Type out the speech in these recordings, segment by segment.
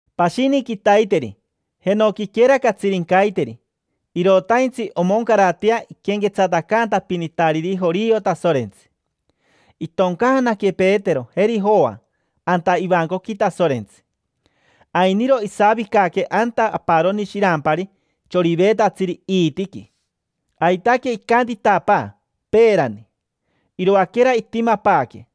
Pashini quitaiteri, jenoquiquera catsirincaiteri, irotaintsi omoncaratea iquenquetsatacaantapinitariri jorio Tasorentsi. Itoncaanaque Petero, jeri Joa anta ivancoqui Tasorentsi. Ainiro isavicaque anta aparoni shirampari, choriveetatsiri iitiqui. Aitaque icantitapaa peerani, iroaquera itimapaaque.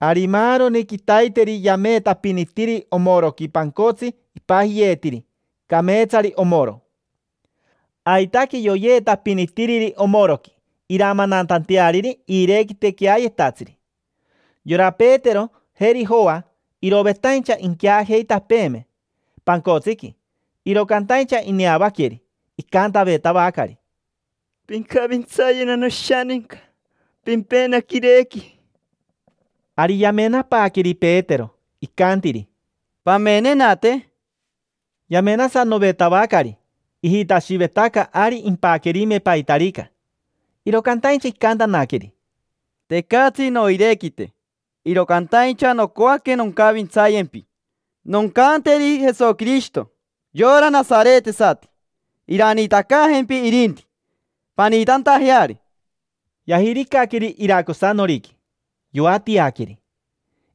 Ari maaroni quitaiteri yameetapinitiri omoroqui pancotsi ipajiyeetiri: “Cameetsari omoro”. Aitaque yoyeetapinitiriri omoroqui iramananteariri iirequite queayetatsiri. Yora Petero, jeri Joa irovetaincha inqueajeitapeeme pancotsiqui, iro cantaincha ineavaqueri, icantavetavacari: —Pincavintsayena noshaninca, pimpena quirequi. Ari yamenapaaqueri Petero, icantiri: —Pamenenate. Yamenasanovetavacari, ijitashivetaca ari impaquerime paitarica. Iro cantaincha icantanaqueri: —Tecatsi noirequite, iro cantaincha nocoaque noncavintsayempi. Noncanteri Jesoquirishito, yora nasaretesati iraniitacaajempi irinti, paniitantajeari. Yajiricaqueri iracosanoriqui, yoatiaqueri.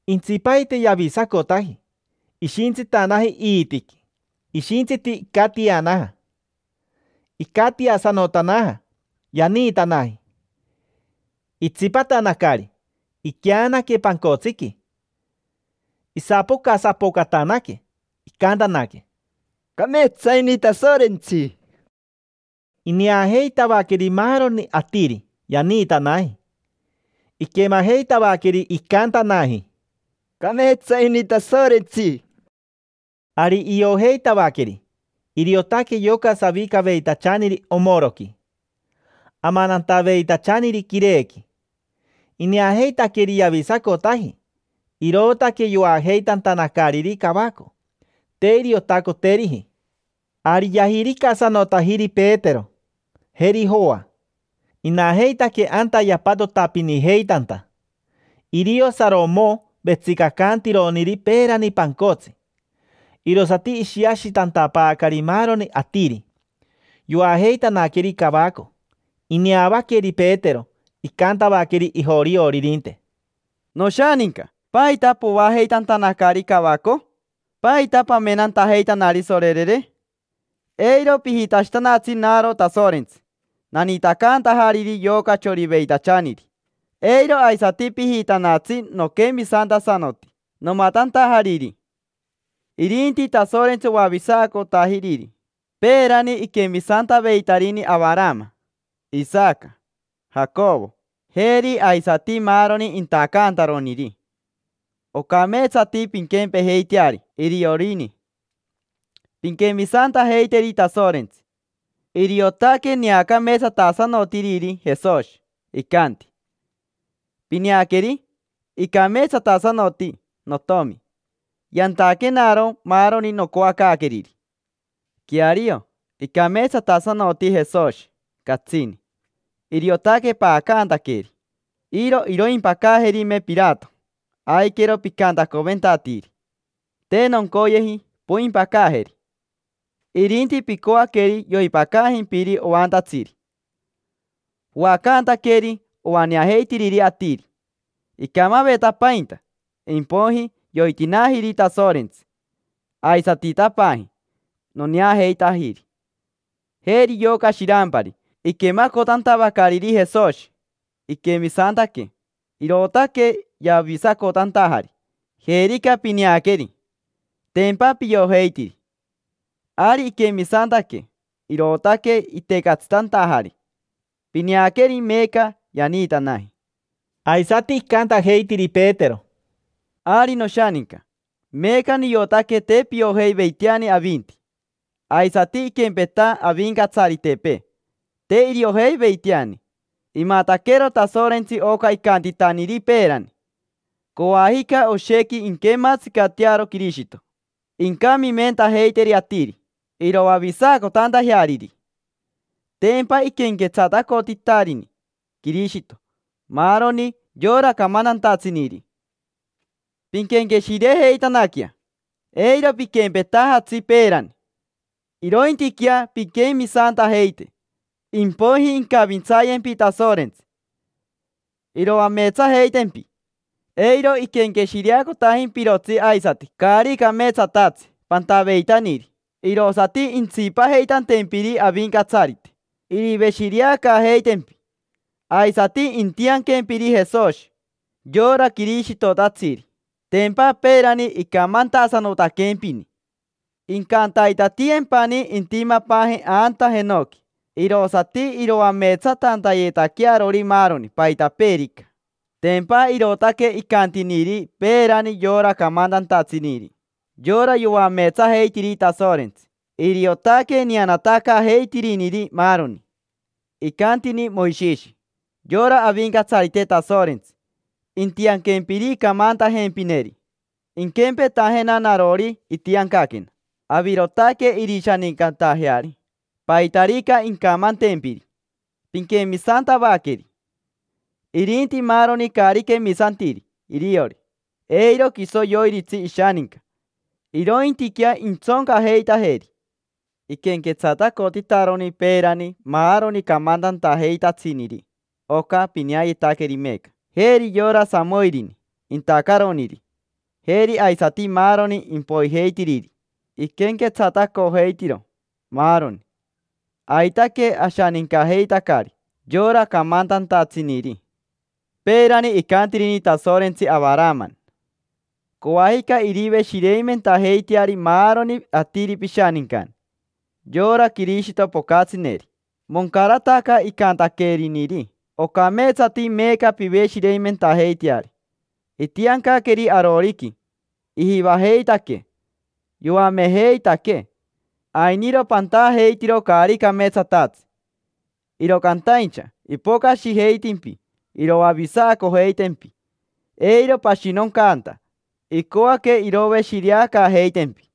Intsipaite yavisacotaji, ishintsitanaji iitiqui. Ishintsiti icatianaja, cati. Icatiasanotanaja, yaniitanaji. Itsipatanacari, iqueanaque pancotsiqui. Isapocasapocatanaque, icantanaque: —Cameetsa ini Tasorentsi. Ineajeitavaqueri maaroni atiri: yaniitanaji. Iquemajeitavaqueri icantanaji: —Cameetsa ini Tasorentsi. Ari iojeitavaqueri, iriotaque yoca savicaveitachaniri omoroqui, amanantaveitachaniri quirequi. Ineajeitaqueri yavisacotaji, irootaque yoajeitantanacariri cavaco. Te iriotacoteriji. Ari yajiricasanotajiri Petero, jeri Joa. Inajeitaque anta yapatotapinijeitanta: irio Saromo vetsicacantironiri peerani pancotsi. Irosati ishiashitantapaacari maaroni atiri, yoajeitanaqueri cavaco. Ineavaqueri Petero, icantavaqueri ijorioririnte: —Noshaninca, ¿paita poajeitantanacari cavaco? ¿Paita pamenantajeitanari, sorerere? Eiro pijitashitanatsi naro Tasorentsi naniitacantajariri yoca choriveitachaniri. Eiro aisati pijitanatsi noquemisantasanoti nomatantajariri. Irinti Tasorentsi oavisacotajiriri. Peerani iquemisantaveitarini Avarama, Isaca, Jacovo, jeri aisati maaroni intacantaroniri. Ocameetsati pinquempejeiteari iriorini, pinquemisantajeiteri Tasorentsi. Iriotaque neacameetsatasanotiriri Jesoshi, icanti: “Pineaqueri, icameetsatasanoti Notomi, yantaquenaro maaroni nocoacaaqueriri”. Queario icameetsatasanoti Jesoshi, catsini. Iriotaque paacantaqueri. Iro iroimpacaajerime Pirato, aiquero picantacoventatiiri: “Te noncoyeji poimpacaajeri”, irinti picoaqueri yoipacajimpiri oantatsiri. Poacantaqueri oaneajeitiriri atiri. Icamavetapainta, impoiji yoitinaajiri Tasorentsi. Aisatitapaaji, noneajeitajiri. Jeri yoca shirampari: iquemacotantavacariri Jesoshi, iquemisantaque, irootaque yavisacotantajari. Jerica pineaqueri. Tempa piojeitiri. Ari iquemisantaque, irootaque itecatsitantajari. Pineaqueri meeca yaniitanaji. Aisati icantajeitiri Petero: —Ari noshaninca, meeca niotaque te piojeiveiteani avinti. Aisati iquempeta avincatsaritepee, te iriojeiveiteani. Imataquero Tasorentsi oca icantitaniri peerani: “Coajica oshequi inquematsicatearo Quirishito, incamimentajeiteri atiri iroavisacotantajeariri”. Tempa iquenquetsatacotitarini Quirishito maaroni yora camantantatsiniri. Pinquenqueshirejeitanaquea, eiro piquempejeitajatsi peerani, irointiquea pinquemisantajeite; impoiji incavintsayempi Tasorentsi: iroameetsajeitempi, eiro iquenqueshireacotajimpirotsi aisati caari cameetsatatsi pantaveitaniri. Irosati intsipajeitantempiri Avincatsarite, iriveshireacaajeitempi. Aisati intianquempiri Jesoshi, yora Quirishitotatsiri. Tempa peerani icamantasanotaquempini. Incantaitatiyempani intimapaaje anta jenoqui, irosati iroameetsatantayetaquearori maaroni, paitapeerica. Tempa irootaque icantiniri peerani yora camantantatsiniri, yora yoameetsajeitiri Tasorentsi: iriotaque neanatacaajeitiriniri maaroni. Icantini Moishishi: “Yora Avincatsarite Tasorentsi intianquempiri camantajempineri, inquempetajena narori itiancaquena. Avirotaque irishanincatajeari. Paitarica incamantempiri, pinquemisantavaqueri. Irinti maaroni caari quemisantiri iriori, eiro quiso yoiritsi ishaninca, irointiquea intsoncajeitajeri”. Iquenquetsatacotitaroni peerani maaroni camantantajeitatsiniri oca pineayetaqueri meeca. Jeri yora Samoirini, intacaroniri, jeri aisati maaroni impoijeitiriri. Iquenquetsatacojeitiro, maaroni. Aitaque ashanincajeitacari yora camantantatsiniri. Peerani icantirini Tasorentsi Avarama: “Coajica iriveshireimentajeiteari maaroni atiri pishanincani: yora Quirishito pocatsineri”. Moncarataca icantaqueriniri. Ocameetsati meeca piveshireimentajeiteari. Itiancaqueri aroriqui, ijivajeitaquee yoamejeitaquee. Ainiro pantajeitiro caari cameetsatatsi, iro cantaincha ipocashijeitimpi iroavisacojeitempi eiro pashinoncanta; icoaque iroveshireacaajeitempi.